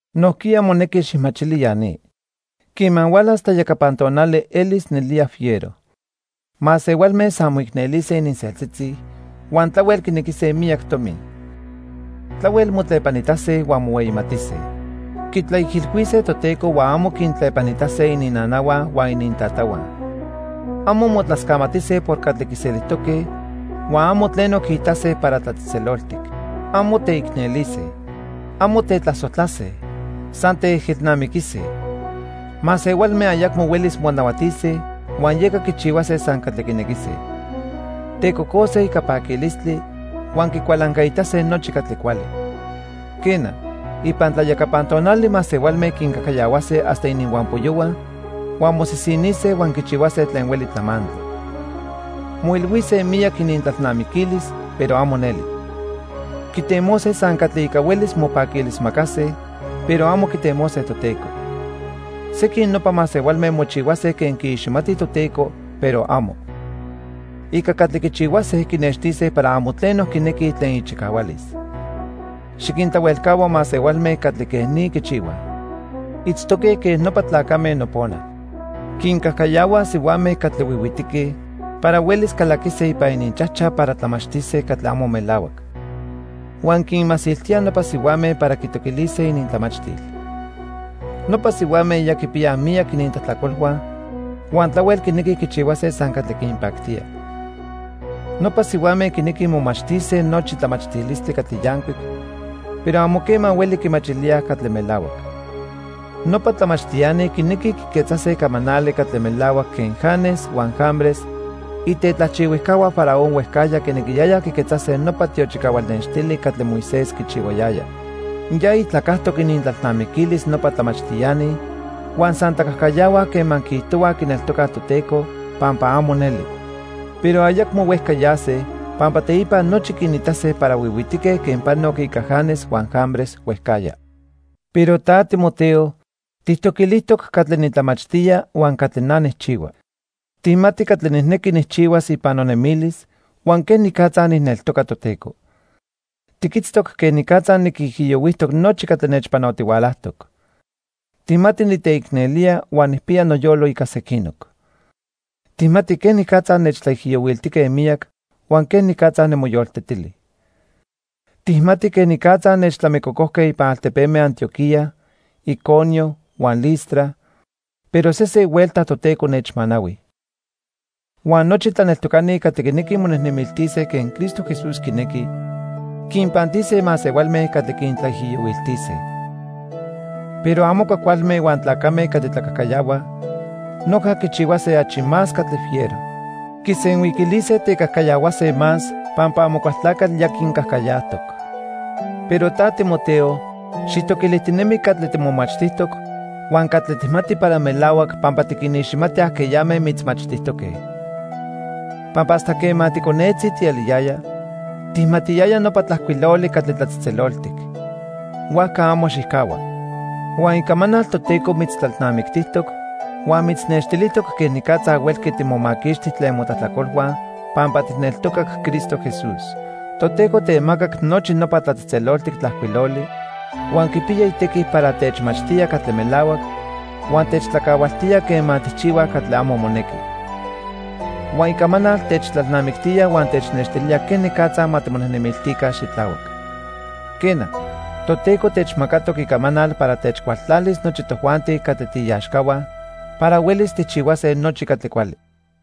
Nojquiya monequi xijmachili ya ni. Quema hualas tlayacapan tonali elis nelía fiero. Masehualme san moicnelise ininseltzitzi huan tlahuel quinequise miyac tomi. Tlahuel motlepanitase huan mohueyimatise. Quitlaijilhuise Toteco huan amo quintlepanitase ininnanahua huan inintatahua. Amo motlascamatise por catli quiselijtoque huan amo tleno quiitase para tlatzejtzeloltic. Amo teicnelise. Amo tetlasojtlase. San teejelnamiquise. Masehualme ayacmo huelis monahuatise huan yeca quichihuase san catli quinequise. Tecocose ica paquilistli, huan quicualancaitase nochi catli cuali. Quena, ipan tlayacapan tonali masehualme quincajcayahuase hasta ininhuampoyohua huan mosisinise huan quichihuase tlen hueli tlamantli. Moilhuise miyac inintlalnamiquilis, pero amo neli. Quitemose san catli ica huelis mopaquilismacase, pero amo quitemose Toteco. Sequin nopa masehualme mochihuase quen quiiximatij Toteco, pero amo. Ica catli quichihuase quinextise para amo tleno quinequij tlen ichicahualis. Xiquintlahuelcahua masehualme catli quej ni quichihuaj. Itztoque quen nopa tlacame nopona. Quincajcayahuaj sihuame catli huihuitique para huelis calaquise ipan ininchajchaj para tlamachtise catli amo melahuac. Huan quinmasiltíaj nopa sihuame para quitoquilise inintlamachtil. Nopa sihuame ya quipiyaj miyac inintlajtlacolhua huan tlahuel quinequij quichihuase san catli quinpactía. Nopa sihuame quinequij momachtise nochi tlamachtilistli catli yancuic, pero amo quema hueli quimachilíaj catli melahuac. Nopa tlamachtiani quinequij quiquetzase camanali catli melahuac quen Janes huan Jambres, itetlajchihuijcahua Faraón huejcajya quinequiyayaj quiquetzase nopa tiochicahual nextili catli Moisés quichihuayaya. Ya ijtlacajtoc inintlalnamiquilis nopa tlamachtiani huan san tlacajcayahuaj quema quiijtohuaj quineltocaj Toteco, pampa amo neli. Pero ayacmo huejca yase, pampa teipa nochi quinitase para huihuitique quen panoc ica Janes huan Jambres huejcajya. Pero ta Timoteo, tijtoquilijtoc catli nitlamachtía huan catli na nijchihua. Tijmati catli nijnequi nijchihuas ipan nonemilis huan quenicatza nijneltoca Toteco. Tiquitztoc quenicatza niquijiyohuijtoc nochi catli nechpanotihualajtoc. Tijmati niteicnelía huan nijpiya noyolo ica sequinoc. Tijmati quenicatza nechtlaijiyohuiltijque miyac huan quenicatza nimoyoltetili. Tijmati quenicatza nechtlamicocojque ipan altepeme Antioquía, Iconio huan Listra, pero sesen huelta Toteco nechmanahui. Huan nochi tlaneltocani catli quinequij monejnemiltise quen Cristo Jesús quinequi, quinpantise masehualme catli quintlaijiyohuiltise. Pero amo cuajcualme huan tlacame catli tlacajcayahuaj noja quichihuase achi más catli fiero. Quisenhuiquilise tecajcayahuase más pampa Amocualtlacatl ya quincajcayajtoc. Pero ta, Timoteo, xijtoquilijtinemi catli timomachtijtoc huan catli tijmati para melahuac pampa tiquiniximati ajqueyame mitzmachtijtoque. Pampa hasta quema ticonetzi tieliyaya, tijmatiyaya nopa Tlajcuiloli catli tlatzejtzeloltic. Huajca amo xijcahua. Huan Icamanal Toteco mitztlalnamictijtoc huan mitznextilijtoc quenicatza huelqui timomaquixti tlen motlajtlacolhua pampa tijneltocac Cristo Jesús. Toteco temacac nochi nopa Tlatzejtzeloltic Tlajcuiloli, huan quipiya itequi para techmachtía catli melahuac huan techtlacahualtía quema tijchihuaj catli amo monequi. Huan Icamanal techtlalnamictía huan technextilía quenicatza ma timonejnemiltica xitlahuac. Quena, Toteco techmacatoc Icamanal para techcualtlalis nochi tojuanti catli tiiaxcahua para huelis tijchihuase nochi catli cuali.